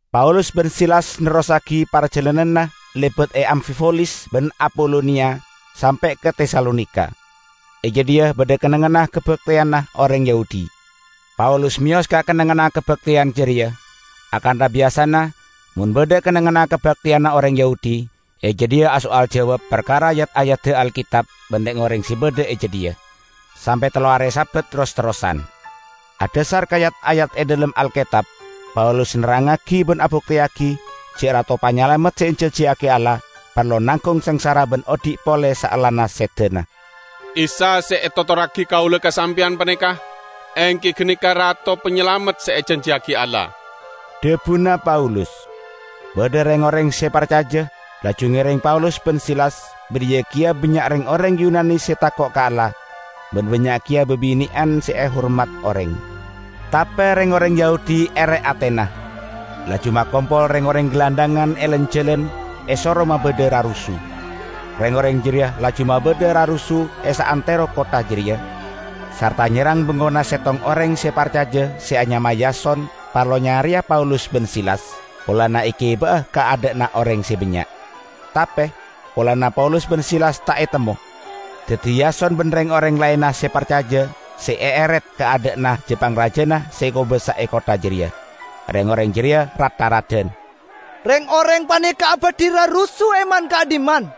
Paulus ban Silas nerrossagi parjalananna lebat e Amfipolis ban Apoloniya sampe' ka Tesalonika. E jadhiya badha kennengnganna kabakteyanna oreng Yahudi. Paulus meyos ka kennengnganna kabakteyan jareya -- akantha biyasana mon badha kennengnganna kabakteyanna oreng Yahudi -- e jadhiya aso'al jawab parkara yat-ayadda Alketab ban reng-oreng se badha e jadhiya, sampe' tello are Sabat ros-terrosan. Adhasar ka yat-ayat e dhalem Alketab Paulus nerrangngagi ban abukteyagi ja' Rato Panyalamet se ejanjiyagi Allah parlo nanggung sangsara ban odhi' pole saellana sedana. "Isa se etotorragi kaula ka sampeyan paneka, enggi ganeka Rato Panyalamet se ejanjiyagi Allah," dhabuna Paulus. Badha reng-oreng se parcaja, laju ngereng Paulus ban Silas; bariya keya bannya' reng-oreng Yunani se tako' ka Allah, ban bannya' keya babine'an se ehormat oreng. Tape reng-oreng Yahudi ere atena, laju makompol reng-oreng gelandhangan e lan-jalan esoro mabadha rarusu. Reng-oreng jareya laju mabadha rarusu e saantero kottha jareya, sarta nyerrang bengkona settong oreng se parcaja se anyama Yason parlo nyareya Paulus ban Silas, polana egiba'a ka adha'na oreng se bannya'. Tape, polana Paulus ban Silas ta' etemmo, daddi Yason ban reng-oreng laenna se parcaja se eeret ka adha'na ja-pangraja se kobasa e kottha jareya. Reng-oreng jareya rat-tharadan, "Reng-oreng paneka abadhi rarusu e man-ka'dhimman.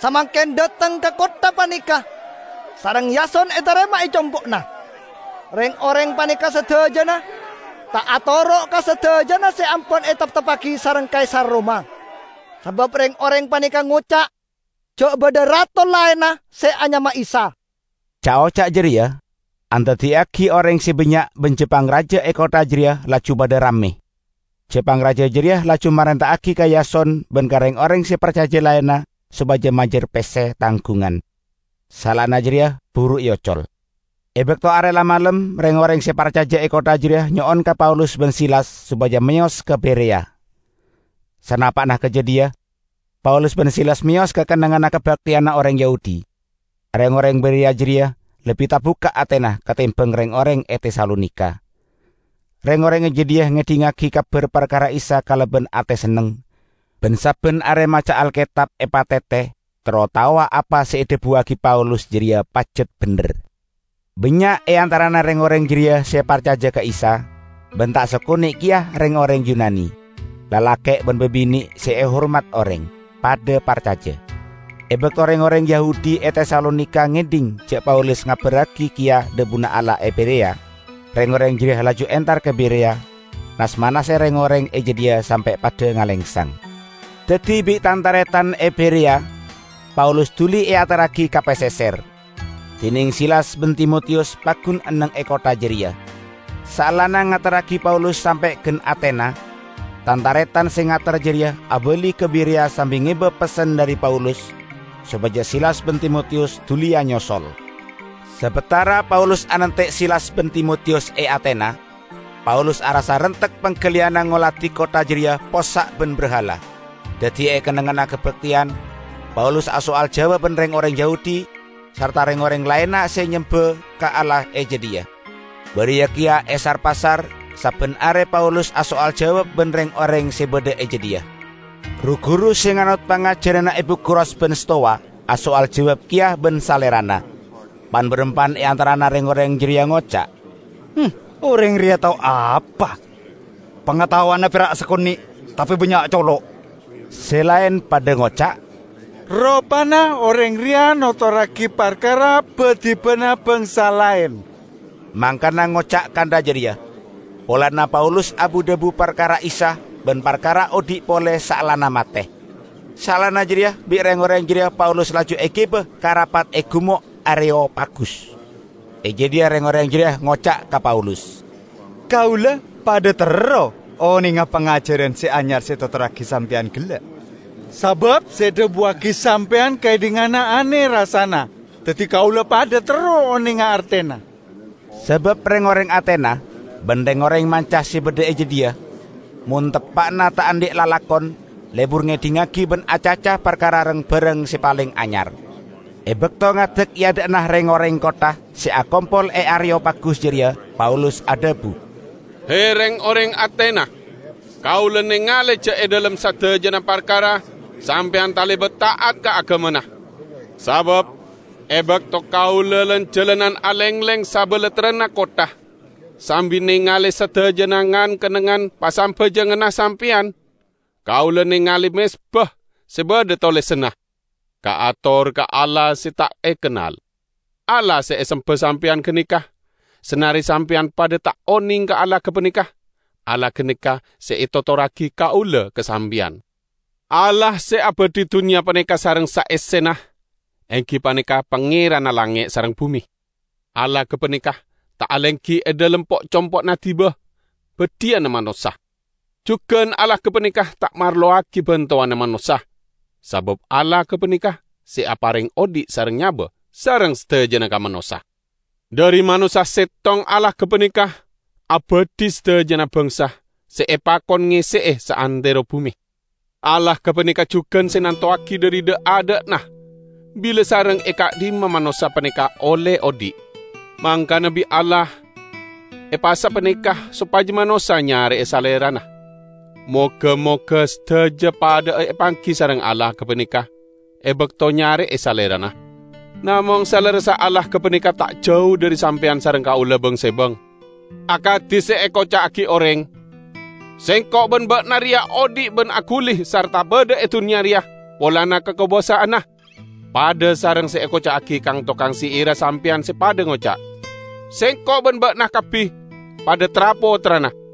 Samangken dhateng ka kottha paneka, sareng Yason etarema e compo'na. Reng-oreng paneka sadajana ta' atoro' ka sadajana se ampon etepteppagi sareng Kaisar Roma, sabab reng-oreng paneka ngoca' ja' badha rato laenna se anyama Isa." Ca'-oca' jareya andaddiyagi oreng se bannya' ban ja-pangraja e kottha jareya laju padha ramme. Ja-pangraja jareya laju marenta'agi ka Yason ban reng-oreng se parcaja laenna sopaja majar pesse tanggungan, saellana jareya buru eocol. E bakto are la malem reng-oreng se parcaja e kottha jareya nyo'on ka Paulus ban Silas sopaja meyos ka Bereya. Sanapa'na ka jadhiya, Paulus ban Silas meyos ka kennengnganna kabakteyanna oreng Yahudi. Reng-oreng Bereya jareya lebbi tabukka' atena katembang reng-oreng e Tesalonika. Reng-oreng e jadhiya ngedhingngagi kabar parkara Isa kalaban ate senneng, ban sabban are maca Alketab epatete terro taowa apa se edhabuwagi Paulus jareya pajat bendher. Bannya' e antarana reng-oreng jareya se parcaja ka Isa, ban ta' sakone' keya reng-oreng Yunani, lalake' ban babine' se ehormat oreng, padha parcaja. E bakto reng-oreng Yahudi e Tesalonika ngedhing ja' Paulus ngabarragi keya dhabuna Allah e Bereya, reng-oreng jareya laju entar ka Bereya, nas-manase reng-oreng e jadhiya sampe' padha ngalengsang. Daddi bi' tan-taretan e Bereya Paulus duli eaterragi ka paseser, dineng Silas ban Timotiyus paggun enneng e kottha jareya. Saellana ngaterragi Paulus sampe' gan Atena, tan-taretan se ngater jareya abali ka Bereya sambi ngeba pessen dhari Paulus sopaja Silas ban Timotiyus duliya nyosol. Sabatara Paulus anante' Silas ban Timotiyus e Atena, Paulus arassa rentek panggaliyanna ngoladi kottha jareya possa' ban brahala. Daddi e kennengnganna kabakteyan Paulus aso'al jawab ban reng-oreng Yahudi sarta reng-oreng laenna se nyemba ka Allah e jadhiya. Bariya keya e sar-pasar sabban are Paulus aso'al jawab ban reng-oreng se badha e jadhiya. Ru-guru se nganot pangajaranna Epikuros ban Stowa aso'al jawab keya ban salerana. Pan-barampan e antarana reng-oreng jareya ngoca', "Oreng reya tao apa? Pangataowanna pera' sakone', tape bannya' colo'!" Se laen padha ngoca', "Ropana oreng reya notorragi parkara ba-dibana bangsa laen." Mangkana ngoca' kantha jareya, polana Paulus abu-dhabu parkara Isa ban parkara odhi' pole saellana mate. Saellana jareya bi' reng-oreng jareya Paulus laju egiba ka rapat e Gumo' Areyopagus. E jadhiya reng-oreng jareya ngoca' ka Paulus, "Kaula padha terro onenga pangajaran se anyar se etotorragi sampeyan gella'. Sabab se edhabuwagi sampeyan kaedhinganna ane rassana. Daddi kaula padha terro onenga artena." ( Sabab reng-oreng Atena ban reng-oreng manca se badha e jadhiya mon teppa'na ta' andhi' lalakon lebur ngedhingngagi ban acaca parkara rang-barang se paleng anyar.) E bakto ngadek e adha'na reng-oreng kottha se akompol e Areyopagus jareya Paulus adhabu, "He, reng-oreng Atena! Kaula nengale ja' e dhalem sadajana parkara sampeyan talebat ta'at ka agamana. Sabab e bakto kaula lan-jalanan alengleng sabalattrana kottha sambi nengale sadajana ngan-kennengngan pasambajanganna sampeyan, kaula nengale mezba se badha tolesanna, 'Kaator ka Allah Se Ta' Ekennal.' Allah se esemba sampeyan ganeka, sanare sampeyan padha ta' oneng ka Allah gapaneka, Allah ganeka se etotorragi kaula ka sampeyan. Allah se abadhi dunnya paneka sareng saessena enggi paneka Pangeranna langnge' sareng bume. Allah gapaneka ta' alenggi e dhalem po'-compo'na diba badhiyanna manossa. Jugan Allah gapaneka ta' marlowagi bantowanna manossa, sabab Allah gapaneka se apareng odhi' sareng nyaba sareng sadajana ka manossa. Dhari manossa settong Allah gapaneka abadhi sadajana bangsa se epakon ngesse'e saantero bume. Allah gapaneka jugan se nantowagi dhari dha'-adha'na bila sareng e ka'dhimma manossa paneka olle odhi'. Mangkana bi' Allah epasapaneka sopaja manossa nyare'e Salerana. Moga-moga sadaja padha'a apanggi sareng Allah gapaneka e bakto nyare'e Salerana. Namong salerressa Allah gapaneka ta' jau dhari sampeyan sareng kaula bang-sebang. Akadi se ekoca'agi oreng, 'Sengko' ban ba'na reya odhi' ban aguli sarta badha e dunnya reya polana kakobasa'anna.' Padha sareng se ekoca'agi kang-tokang syi'irra sampeyan se padha ngoca', 'Sengko' ban ba'na kabbi padha tra-pottrana.'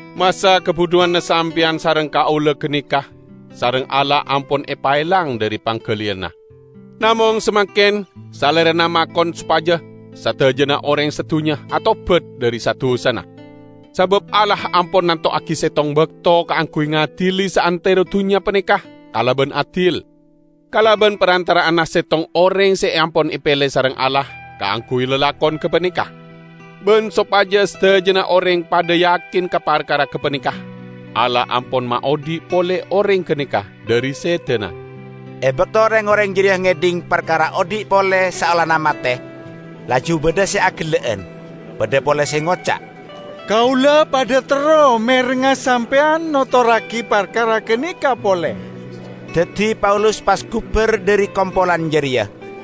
Masa kabudhuwanna sampeyan sareng kaula ganeka sareng Allah ampon epaelang dhari panggaliyanna, namong samangken Salerana makon sopaja sadajana oreng sadunnya atobat dhari sa-dusana. Sabab Allah ampon nantowagi settong bakto kaangguy ngadili saantero dunnya paneka kalaban adil, kalaban parantara'anna settong oreng se ampon epele sareng Allah kaangguy lalakon gapaneka. Ban sopaja sadajana oreng padha yakin ka parkara gapaneka, Allah ampon maodhi' pole oreng ganeka dhari sedana!" E bakto reng-oreng jareya ngedhing parkara odhi' pole saellana mate, laju badha se agella'an. Badha pole se ngoca', "Kaula padha terro merengnga sampeyan notorragi parkara ganeka pole." Daddi Paulus pas gubar dhari kompolan jareya.